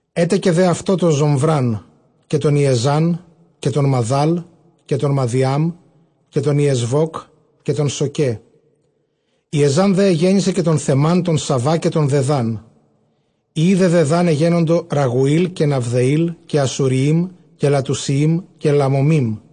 Ἔτεκε δὲ αὐτῷ τὸν Ζομβρᾶν, καὶ τὸν Ἰεζὰν, καὶ τὸν Μαδὰλ, καὶ τὸν Μαδιὰμ, καὶ τὸν Ἰεσβὼκ, καὶ τὸν Σωίε. Ἰεζὰν δὲ ἐγέννησε τὸν Σαβὰ, καὶ τὸν Δεδάν· υἱοὶ δὲ Δεδὰν Ἀσσουριεὶμ, καὶ Λατουσιεὶμ, καὶ Λαωμείμ.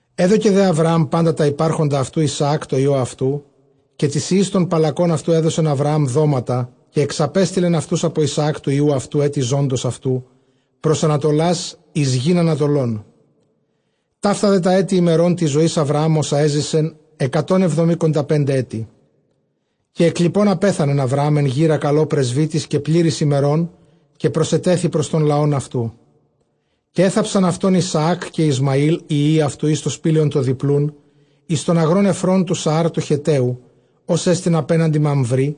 Ἔδωκε δὲ Ἁβραὰμ πάντα τὰ ὑπάρχοντα αὐτοῦ Ἰσαὰκ τῷ υἱῷ αὐτοῦ. Καὶ τοῖς υἱοῖς τῶν παλλακῶν αὐτοῦ ἔδωκεν Ἁβραὰμ δόματα, καὶ ἐξαπέστειλεν αὐτοὺς ἀπὸ Ἰσαὰκ τοῦ υἱοῦ αὐτοῦ, ἔτι ζῶντος αὐτοῦ, πρὸς ἀνατολὰς εἰς γῆν ἀνατολῶν. Ταῦτα δὲ τὰ ἔτη ἡμερῶν τῆς ζωῆς Ἁβραὰμ ὅσα ἔζησεν, ἑκατὸν ἑβδομηκονταπεντε ἔτη. Καὶ ἐκλείπων ἀπέθανεν Ἁβραὰμ ἐν γήρᾳ καλῷ πρεσβύτης, καὶ πλήρης ἡμερῶν, καὶ προσετέθη πρὸς τὸν λαὸν αὐτοῦ. Καὶ ἔθαψαν αὐτὸν Ἰσαὰκ καὶ Ἰσμαὴλ οἱ υἱοὶ αὐτοῦ εἰς τὸ σπήλαιον τὸ διπλοῦν, εἰς τὸν ἀγρὸν Ἐφρων τοῦ Σαὰρ τοῦ Χετταίου, ὅς ἐστιν ἀπέναντι Μαμβρῆ,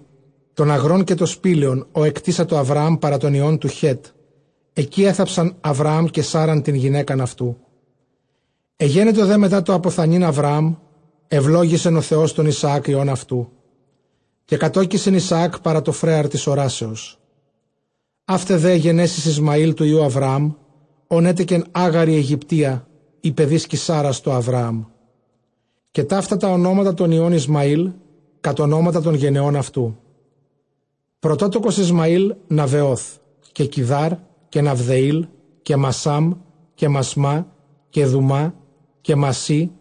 τὸν ἀγρὸν καὶ τὸ σπήλαιον, ὃ ἐκτήσατο Ἁβραὰμ παρὰ τῶν υἱῶν τοῦ Χέτ· ἐκεῖ ἔθαψαν Ἁβραὰμ, καὶ Σάῤῥαν τὴν γυναῖκα αὐτοῦ. Ἐγένετο δὲ μετὰ τὸ ἀποθανεῖν Ἁβραὰμ, εὐλόγησεν ὁ Θεὸς τὸν Ἰσαὰκ υἱὸν αὐτοῦ· καὶ κατῴκησεν Ἰσαὰκ παρὰ τὸ φρέαρ τῆς ὁράσεως. Αὗται δὲ αἱ γενέσεις Ἰσμαὴλ τοῦ υἱοῦ Ἁβραὰμ, ὃν ἔτεκεν Ἄγαρ ἡ Αἰγυπτία, ἡ παιδίσκη Σάῤῥας, τῷ Ἁβραάμ. Καὶ ταῦτα τὰ ὀνόματα τῶν υἱῶν Ἰσμαὴλ, κατʼ ὀνόματα τῶν γενεῶν αὐτοῦ· πρωτότοκος Ἰσμαὴλ, καὶ Ναβαϊὼθ, καὶ Κηδὰρ, καὶ Ναβδεὴλ, καὶ Μασσὰμ, καὶ Μασμὰ, καὶ Δουμὰ, καὶ Μασσῆ,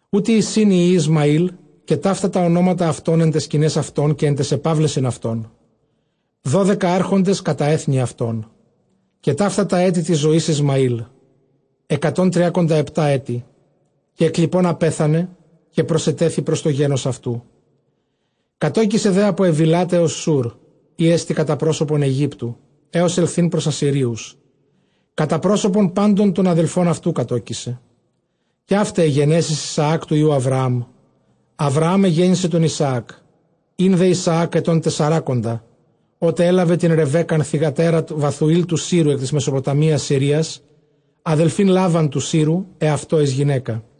οὗτοί εἰσιν οἱ υἱοὶ Ἰσμαὴλ, καὶ ταῦτα τὰ ὀνόματα αὐτῶν ἐν ταῖς σκηναῖς αὐτῶν, καὶ ἐν ταῖς ἐπαύλεσιν αὐτῶν· δώδεκα ἄρχοντες κατὰ ἔθνη αὐτῶν. Καὶ ταῦτα τὰ ἔτη τῆς ζωῆς Ἰσμαὴλ, ἑκατὸν τριακονταεπτὰ ἔτη· καὶ ἐκλείπων ἀπέθανε, καὶ προσετέθη πρὸς τὸ γένος αὐτοῦ. Κατῴκησε δὲ ἀπὸ Εὐϊλὰτ ἕως Σοὺρ, ἥ ἐστι κατὰ πρόσωπον Αἰγύπτου ἕως ἐλθεῖν πρὸς Ἀσσυρίους· κατὰ πρόσωπον πάντων τῶν ἀδελφῶν αὐτοῦ κατῴκησε. Καὶ αὗται αἱ γενέσεις Ἰσαὰκ τοῦ υἱοῦ Ἁβραάμ· Ἁβραάμ ἐγέννησε τὸν Ἰσαάκ. Ἦν δὲ Ἰσαὰκ ἐτῶν τεσσαράκοντα ὅτε ἔλαβε τὴν Ῥεβέκκαν θυγατέρα Βαθουὴλ τοῦ Σύρου ἐκ τῆς Μεσοποταμίας Συρίας, ἀδελφὴν Λάβαν τοῦ Σύρου, ἑαυτῷ εἰς γυναῖκα.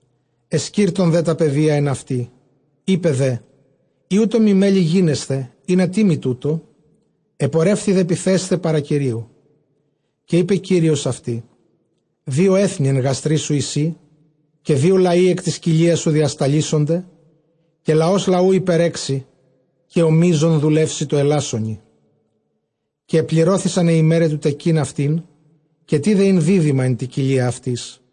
Ἐσκίρτων δὲ τὰ παιδία ἐν αὐτῇ· εἶπε δὲ, εἰ οὕτω μοι μέλλει γίνεσθαι, ἵνα τί μοι τοῦτο; ἐπορεύθη δὲ πυθέσθαι παρὰ Κυρίου. Καὶ εἶπε Κύριος αὐτῇ, δύο ἔθνη ἐν γαστρί σου εἰσὶ, καὶ δύο λαοὶ ἐκ τῆς κοιλίας σου διασταλήσονται· καὶ λαὸς λαοῦ ὑπερέξει, καὶ ὁ μείζων δουλεύσει τῷ ἐλάσσονι. Καὶ ἐπληρώθησαν αἱ ἡμέραι τοῦ τεκεῖν αὐτήν· καὶ τῇδε ἦν δίδυμα ἐν τῇ κοιλίᾳ αὐτῆς.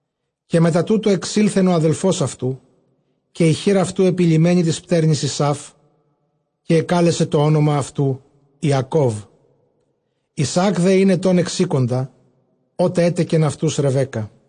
Καὶ μετὰ τοῦτο ἐξῆλθεν ὁ ἀδελφὸς αὐτοῦ, καὶ ἡ χεὶρ αὐτοῦ ἐπειλημμένη τῆς πτέρνης Ἡσαῦ· καὶ ἐκάλεσε τὸ ὄνομα αὐτοῦ, Ἰακώβ. Ἰσαὰκ δὲ ἦν ἐτῶν ἑξήκοντα, ὅτε ἔτεκεν αὐτοὺς Ῥεβέκκα.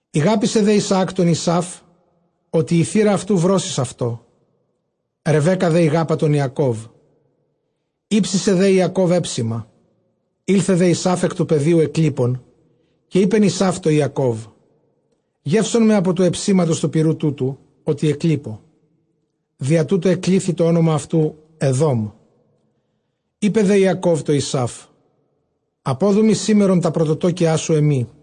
Ἠγάπησε δὲ Ἰσαὰκ τὸν Ἡσαῦ, ὅτι ἡ θήρα αὐτοῦ βρῶσις αὐτῷ· Ῥεβέκκα δὲ ἠγάπα τὸν Ἰακώβ. Ἥψησε δὲ Ἰακὼβ ἕψημα· ἦλθε δὲ Ἡσαῦ ἐκ τοῦ πεδίου ἐκλείπων. Καὶ εἶπεν Ἡσαῦ τῷ Ἰακὼβ, γεῦσόν με ἀπὸ τοῦ ἑψήματος πυῤῥου τούτου, ὅτι ἐκλείπω· διὰ τοῦτο ἐκλήθη τὸ ὄνομα αὐτοῦ, Ἐδώμ. Εἶπε δὲ Ἰακὼβ τῷ Ἡσαῦ, ἀπόδου μοι σήμερον τὰ πρωτοτόκιά σου ἐμοί.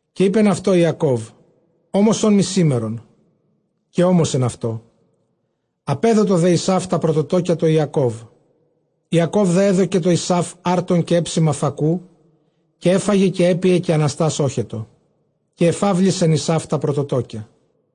Καὶ εἶπεν αὐτῷ Ἰακὼβ, ὄμοσόν μοι σήμερον· καὶ ὤμοσεν αὐτῷ· ἀπέδοτο δὲ Ἡσαῦ τὰ πρωτοτόκια τῷ Ἰακώβ. Ἰακὼβ δὲ ἔδωκε τῷ Ἠσαῦ ἄρτον, καὶ ἕψημα φακοῦ· καὶ ἔφαγε καὶ ἔπιε, καὶ ἀναστὰς ᾤχετο· καὶ ἐφαύλισεν Ἡσαῦ τὰ πρωτοτόκια.